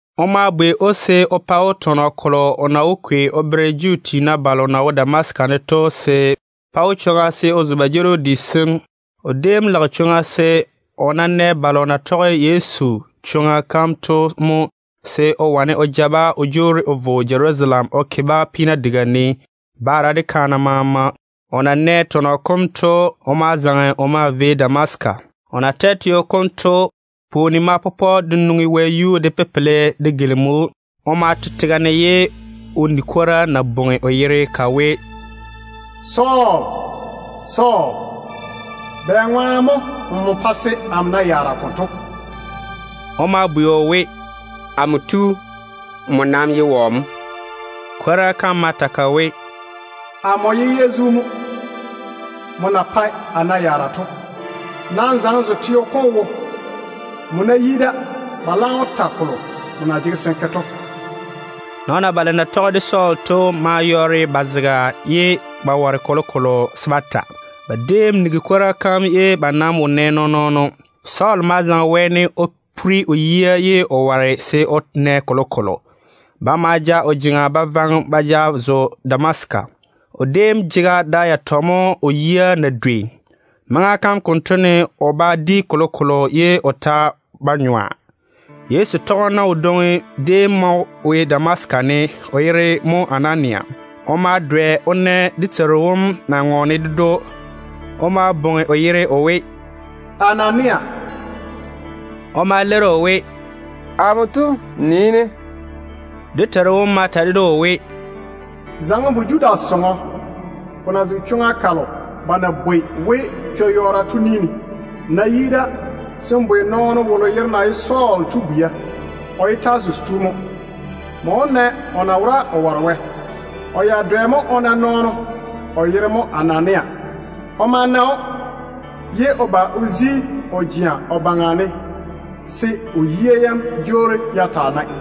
O ma vo o lwoori‑o se o pa‑o tɔnɔ kolo o na wó kwei o bere Juu tiina balo na nii ba jeerim di sem Damasika ne to, se ko pa ba jeeri‑o lanyerane. O déem lage chwoŋa se, o ná nɛ balo na tɔge Wɛ chwo-doŋa kam to mo, se o wane o ja-ba o jwoori o vo Jerusalem o ke-ba peena diga ne, baara de kaana maama. O na nɛ tɔnɔ kom to, o ma zaŋe o maa vei Damasika. O na twɛ teo kom to, pwooni ma pɔpɔ de nwoŋi wɛyuu de pepele de gilimi‑o. O ma to tega ne ye o ni kwora na bwoŋi o yere ka we, “Sɔɔl, Sɔɔl, bɛŋwaane mo nmo jege-ne n bɛɛsa konto?” O de ma bwei o we, “Amo tu, nmo nam ye wɔ mo?” Kwora kam ma ta ka we, “Amo ye Yezu mo, nmo na jege n bɛɛse to. Nam zaŋe n zo teo kom wo. Nmo ná yi da, ba laam wó ta kolo nmo na jege se n ke to.” Nɔɔna balo na tɔge de Sɔɔl to maa yɔɔre ba zega ye ba ware kolokolo se ba ta. Ba déem nigi kwora kam ye ba nam wo nɛ nɔɔn-nɔɔno. Sɔɔl ma zaŋe wɛɛne o puri o yia ye o ware se o na kolokolo. Ba ma ja o jeŋa ba vaŋe‑o ba ja zo Damasika teo wone. O déem jege da yatɔ mo o yia na dwei. Maŋa kam konto ne o ba di kolokolo ye o ta ba nyɔa. Yezu tɔgeno wodwoŋi déem maa wo Damasika ne, o yere mo Anania. O ma dwɛ o na dé Teiru wom na ŋɔɔne ded‑o. O ma bwoŋi o yere o we, “Anania!” O ma leiri o we, “Amo tu, nii-ne.” Dé Teiru wom ma ta ded‑o o we, “Zaŋe n vo Judas sɔŋɔ, ko na zege chwoŋa kalo ba na bwoi we ‘Chwo-yɔɔro’ to ni ne. Nmo ná yi da, se n bwei nɔɔno wolo yere na ye Sɔɔl to bwia. O ye Tasusi tu mo. Nmo wó na o na wora o ware Wɛ. O ya dwɛ mo o na nɔɔno, o yere mo Anania. O ma na‑o ye o ba o daŋe o jea o yuu ne, se o yia yam jwoori ya taa nae.”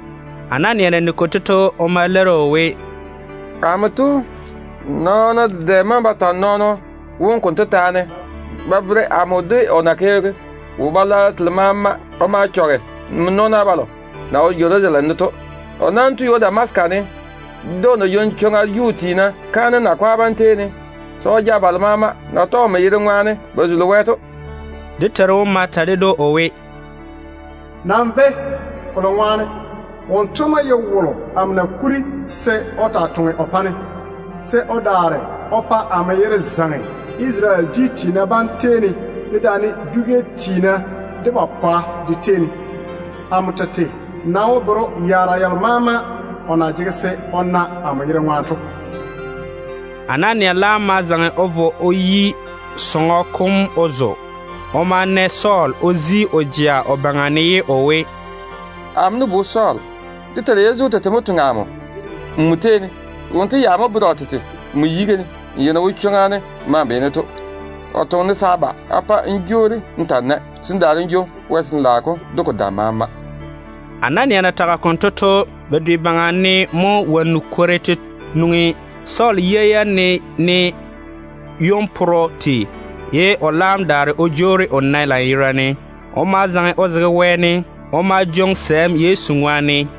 Anania na nigi konto to, o ma leiri o we, “Amo tu, nɔɔna dedɛ maŋe ba ta nɔɔno wom konto taane ba bere amo de o na ke wo-balwaaro telo maama o ma chɔge nmo nɔɔna balo na wo Jerusalem ne to. O laam tu ywo Damasika ne mo de o na jwoŋi chwoŋa Juu tiina kaanem yiga tiina bam tei ne se o ja balo maama na tɔge nmo yere ŋwaane ba zuli Wɛ to.” Dé Teiru wom ma ta ded‑o o we, “Nam véi, kolo ŋwaane wonto mo ye wolo amo na kuri se o taa toŋe o pa-ne, se o daare o zeiŋi amo yere Isarele dwi tiina bam tei ne, dedaane dwi-gɛ tiina de ba pwa de tei ne. Amo tete nam wó bere‑o yaara yalo maama o na jege se o na amo yere ŋwaane to.” Anania laam ma zaŋe o vo o yi sɔŋɔ kom o zo. O ma na Sɔɔl o daare o vo o daŋe o jea o baŋa ne ye o we, “Amo nu-bu Sɔɔl, dé Teiru Yezu tete mo toŋe amo nmo tei ne. Wonto ya mo veere o tete nmo yiga ne, n ya na wo chwoŋa ne n ma‑n beene to. O toŋe-ne se a ba a pa n jwoori n ta‑n nae mo, se n daare n jwoŋi Wɛ Sin-laao kom de ko dam maama.” Anania na tage konto to, bedwe baŋa ne mo wonnu kore te nwoŋi Sɔɔl yia yam ne, ne ywon-porro tei, ye o laam daare o jwoori o nae lanyerane. O ma zaŋe o zege wɛɛne. O ma jwoŋi sɛɛm Yezu ŋwaane.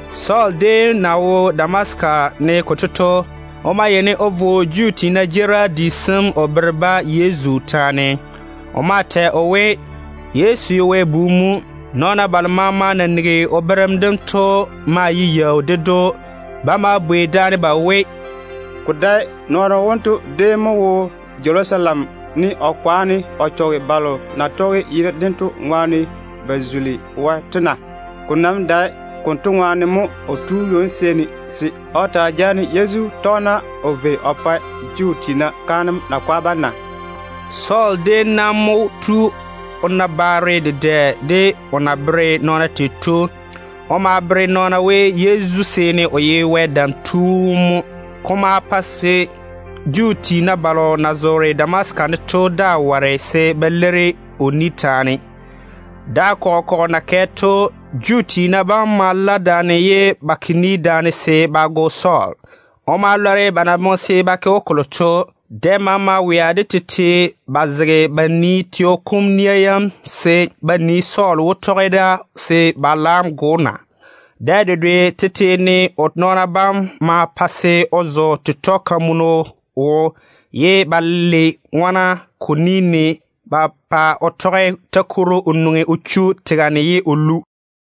Sɔɔl déem na wo Damasika ne konto to, o ma yeini o vo Juu tiina jeerim di sem o bere-ba Yezu taane. O maa tɛ o we, Yezu ye Wɛ Bu mo. Nɔɔna balo maama na nigi o berem dem to maa ye yaau ded‑o. Ba ma bwei daane ba we, “Ko dae nɔɔno wonto déem mo wo Jerusalem ne o kwaane o chɔge balo na tɔge yere dento ŋwaane ba zuli Wɛ to na? Ko nam dae konto ŋwaane mo o tu ywo-seeni se o taa jaane Yezu tɔgena o vei o ke Juu tiina kaanem yiga tiina bam jeŋa ne na?” Sɔɔl déem nam mo tu o na baare dedɛ de o na bere nɔɔna tei to. O maa bere nɔɔna we, Yezu seene o ye Wɛ Dam Tu wom mo. Ko ma pa se Juu tiina balo na zoore Damasika ne to daa ware se ba leiri o ni taane. Da kɔgɔ kɔgɔ na kɛ to, Juu tiina bam ma ke ni daane se ba go Sɔɔl. O ma lɔre ba na boŋe se ba ke‑o kolo to. Dɛ maama wea de tete ba zege ba nii teo kom nia yam se ba nii, Sɔɔl wó tɔge da se ba laam go‑o na. Dɛ dedwe tete ne o nɔɔna bam ma pa se o zo tetɔ-kamunu wo, ye ba lei ŋona ko ni ne ba pa o tɔge takworo o nwoŋi o chu tega ne ye o lu.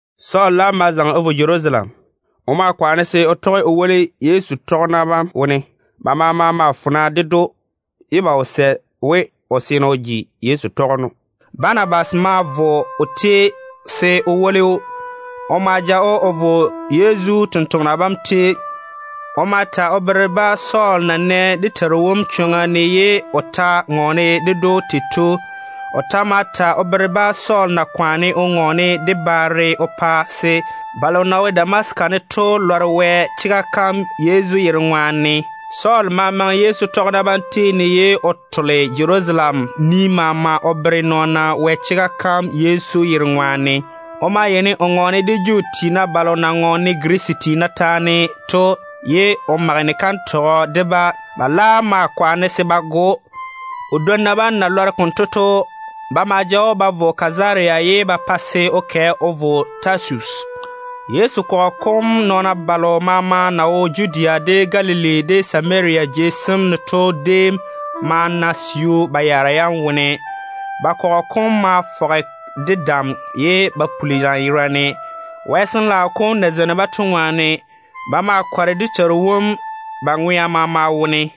Sɔɔl laam ma zaŋe o vo Jerusalem. O maa kwaane se o tɔge o woli Yezu tɔgena bam wone. Ba maama maa fona ded‑o, ye ba wo sɛ we o seene o ji Yezu tɔgeno. Banabas ma vo o tei se o woli‑o. O ma ja‑o o vo Yezu totoŋa nakwa bam tei. O ma ta o bere-ba Sɔɔl na wo chwoŋa ne o via ye o na dé Teiru wom na ŋɔɔne ded‑o tei to. O ta ma ta o bere-ba Sɔɔl na yɔɔre o ŋɔɔne de baare Yezu yere ŋwaane tei to, pa se balo na wo Damasika ne to lɔre Wɛ chega kam. Sɔɔl ma maŋe Yezu tɔgena bam tei ne ye o tole Jerusalem ni maama o bere nɔɔna Wɛ chega kam dé Teiru wom yere ŋwaane. O maa yeini o ŋɔɔne de Juu tiina balo na ŋɔɔne Girisi tiina taane to ye o mage ni-kantɔgɔ de-ba. Ba laam ma kwaane se ba go‑o. O dwonna bam na lɔre konto to, ba ma ja‑o ba ja vo Kazaria. Ba laam ma pa se o kɛ o vo Tasusi. Yezu kɔgɔ kom nɔɔna balo maama na wo Judea, de Galili, de Samaria jei sem ne to déem ma na siu ba yaara yam wone. Ba kɔgɔ kom ma fɔge de dam ye ko puli lanyerane, Wɛ Sin-laao kom na zeini-ba to ŋwaane. Ba maa kɔre dé Teiru wom ba ŋwea maama wone.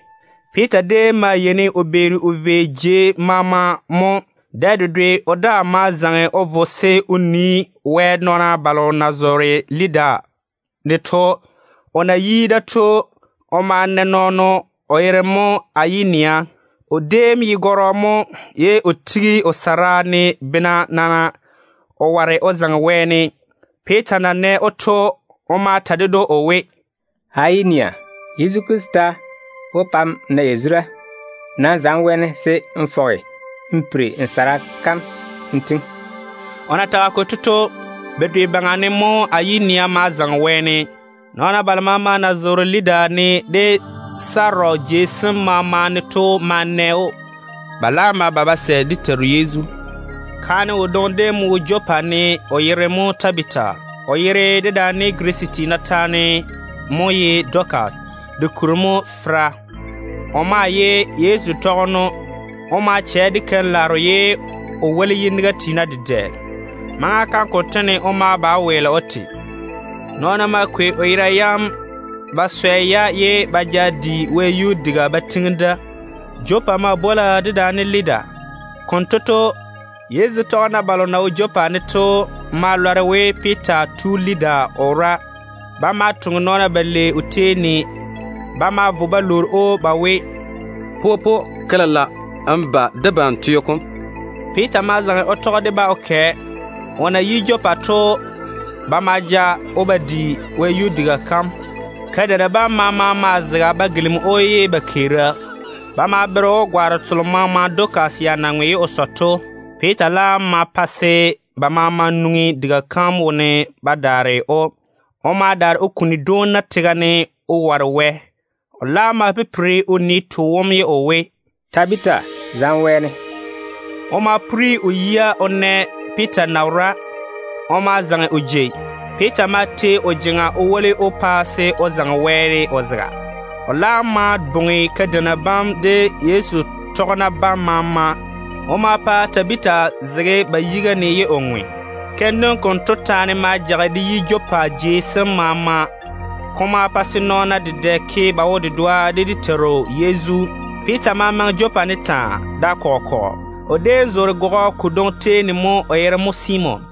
Piita déem yeini o beeri o tole jei maama mo. Dɛ dedwe o daa ma zaŋe o vo se o nii Wɛ nɔɔna balo na zoore Lida ne to. O na yi da to, o ma na nɔɔno, o yere mo Ayinea. O déem ye gɔrɔ mo, ye o tigi o sara ne taa, bena nana, o ware o zaŋe wɛɛne. Piita na nɛ‑o to, o ma ta ded‑o o we, “Ayinea, Yezu Krista wó pa n na yazura. Nam zaŋe wɛɛne se n fɔge n piri n sara kam n tiŋi.” O na tage konto to, bedwe baŋa ne mo Ayinea ma zaŋe wɛɛne. Nɔɔna balo maama na zoore Lida ne de Sarɔn jei sem maama ne to ma na‑o. Ba laam ma ba ba sɛ dé Teiru Yezu. Kaane wodwoŋi déem mo wo Jopa ne, o yere mo Tabita. (O yere dedaane Girisi tiina taane mo ye Dɔkase. Dɔkase kuri mo ye feira.) O maa ye Yezu tɔgeno. O maa chɛ de keim-laaro ye o woli yiniga tiina dedɛ. Maŋa kam konto ne o ma ba o weele o te. Nɔɔna ma kwei o yera yam ba swɛ, ye ba ja‑o ba di wɛyuu diga ba tiŋi da. Jopa maa bwola dedaane Lida. Konto to, Yezu tɔgena balo na wo Jopa ne to ma lɔre we Piita tu Lida o wora. Ba ma toŋe nɔɔna balei o tei ne. Ba ma vo ba lwoori‑o ba we, “Popo, ke lela n ba debam teo kom.” Piita ma zaŋe o tɔge de-ba o kɛ. O na yi Jopa to, ba ma ja‑o ba di wɛyuu diga kam. Kadeina bam maama maa zege ba gilimi‑o ye ba keera. Ba ma bere‑o gwaaro telo maama Dɔkase ya na ŋwe ye o sɔ to. Piita laam ma pa se ba maama nwoŋi diga kam wone ba daare‑o. O ma daare o kuni dwoona tega ne o ware Wɛ. O laam ma pipiri o nii too wom ye o we, “Tabita, zaŋe wɛɛne.” O ma puri o yia o na Piita na wora. O ma zaŋe o jei. Piita ma tei o jeŋa o woli‑o pa se o zaŋe wɛɛne o zega. O laam ma bwoŋi kadeina bam de Yezu tɔgena bam maama. O ma pa Tabita zege ba yiga ne ye o ŋwe. Keim dem konto taane ma jage de yi Jopa jei sem maama. Ko ma pa se nɔɔna dedɛ ke ba wo-dedoa de dé Teiru Yezu. Piita ma maŋe Jopa ne taa, da kɔgɔ kɔgɔ. O déem zoore gɔgɔ kodwoŋi tei ne mo, o yere mo Simon.